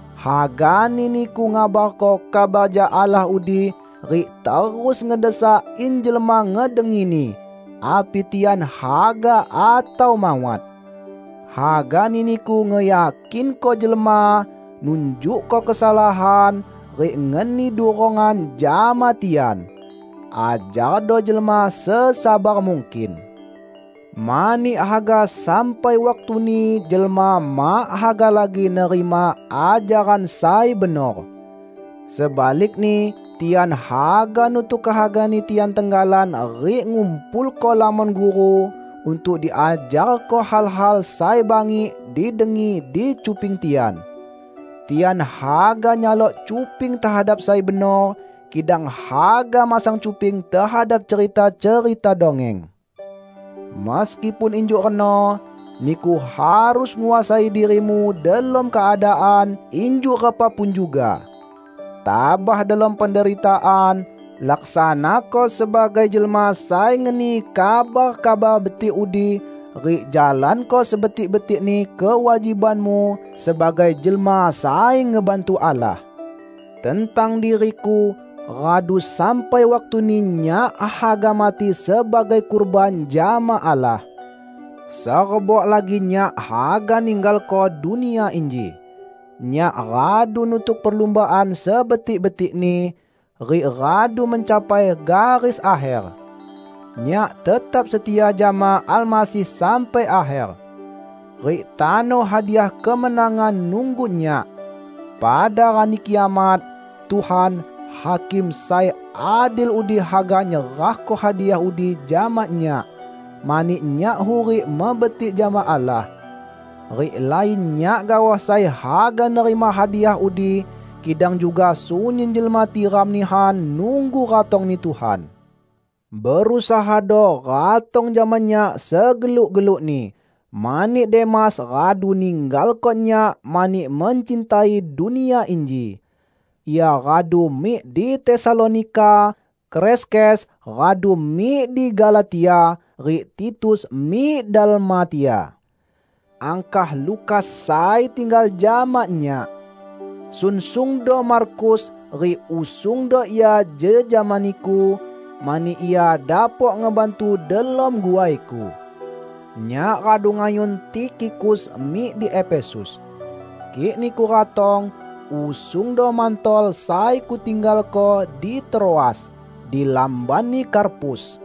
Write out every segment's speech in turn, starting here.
Hagani niku ngabarko kabar jak Allah udi, rik terus ngedesak in jelma ngedengini, api tian haga atau mawat. Hagani niku ngeyakinko jelma, nunjukko kesalahan, rik ngeni durongan jama tian. Ajardo jelma sesabar mungkin. Mani haga sampai waktuni jelma mak haga lagi nerima ajaran sai benor. Sebalikni, tian haga nutuk kehagani tian tenggalan rik ngumpulko lamon guru untuk diajarko hal-hal sai bangik didengi di cuping tian. Tian haga nyalok cuping tehadap sai benor, kidang haga masang cuping tehadap cerita-cerita dongeng. Meskipun injuk reno, niku harus nguasai dirimu delom keadaan injuk repa pun juga. Tabah delom penderitaan, laksanako sebagai jelma sai ngeni kabar Kabar Betik udi rik jalanko sebetik-betikni kewajibanmu sebagai jelma sai ngebantu Allah. Tentang diriku, radu sampai waktuni nyak haga mati sebagai kurban jama Allah. Serebok lagi nyak haga ninggalko dunia inji. Nyak radu nutuk perlumbaan sebetik-betikni, rik radu mencapai garis akher. Nyak tetap setia jama Almasih sampai akher. Rik tano hadiah kemenangan nunggu nyak. Pada Rani Kiamat, Tuhan, Hakim sai adil udi haga nyerahko hadiah udi jama nyak, mani nyak hurik mebetik jama Allah. Rik lain nyak gaoh sai haga nerima hadiah udi, kidang juga sunyin jelma tiram nihan nunggu ratong-Ni Tuhan. Berusahado ratong jama nyak segeluk-gelukni, mani Demas radu ninggalko nyak mani mencintai dunia inji. Ia radu mik di Tesalonika, Kreskes radu mik di Galatia, rik Titus mik Dalmatia. Angkah Lukas sai tinggal jama nyak. Sunsungdo Markus rik usungdo ia jejama niku, mani ia dapok ngebantu delom guaiku. Nyak radu ngayun Tikhikus mik di Efesus. Kik niku ratong, usungdo mantol sai kutinggalko di Troas, di lambanni Karpus.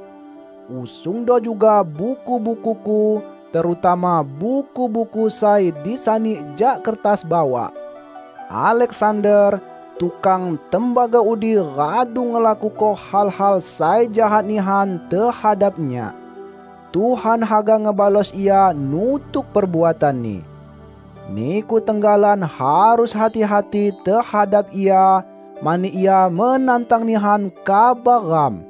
Usungdo juga buku-bukuku, terutama buku-buku sai disani jak kertas bawak. Aleksander, tukang tembaga udi radu ngelakuko hal-hal sai jahat nihan tehadap nyak. Tuhan haga ngebalos ia nutuk perbuatanni. Niku tenggalan harus hati-hati tehadap ia, mani ia menantang nihan kabar ram.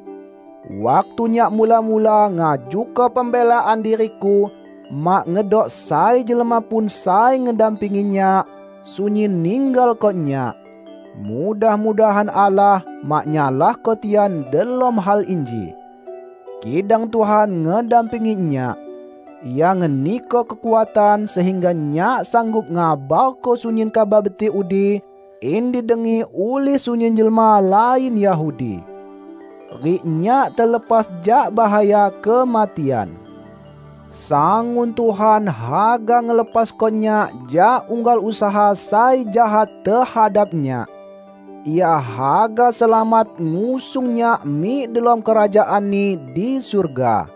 Waktu nyak mula-mula ngajuko pembelaan diriku, mak ngedok sai jelma pun sai ngedampingi nyak; sunyin ninggalko nyak. Mudah-mudahan Allah mak nyalahko tian delom hal inji! Kidang Tuhan ngedampingi nyak. Ia ngeniko kekuatan sehingga nyak sanggup ngabarko sunyin Kabar Betik udi, in didengi ulih sunyin jelma lain Yahudi. Rik nyak telepas jak bahaya kematian. Sangun Tuhan haga ngelepasko nyak jak unggal usaha sai jahat tehadap nyak. Ia haga selamat ngusung nyak mik delom Kerajaan-Ni di surga.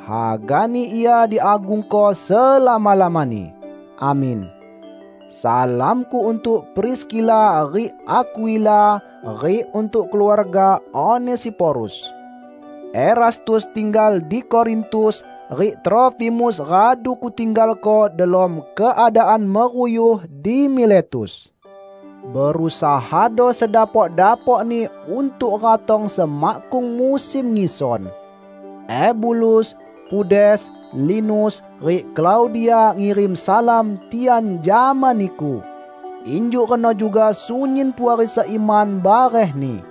Hagani Ia diagungko selama-lamani! Amin. Salamku untuk Priskila rik Akwila rik untuk keluarga Onesiforus. Erastus tinggal di Korintus, rik Trofimus radu kutinggalko delom keadaan meruyuh di Miletus. Berusahado sedapok-dapokni untuk ratong semakkung musim ngison. Ebulus, Pudes, Linus, rik Klaudia ngirim salam tian jama niku; injuk reno juga sunyin puari seiman barehni.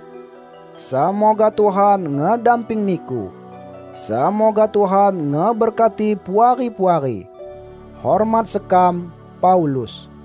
Semoga Tuhan ngedamping niku. Semoga Tuhan ngeberkati Puari-puari! Hormat sekam, Paulus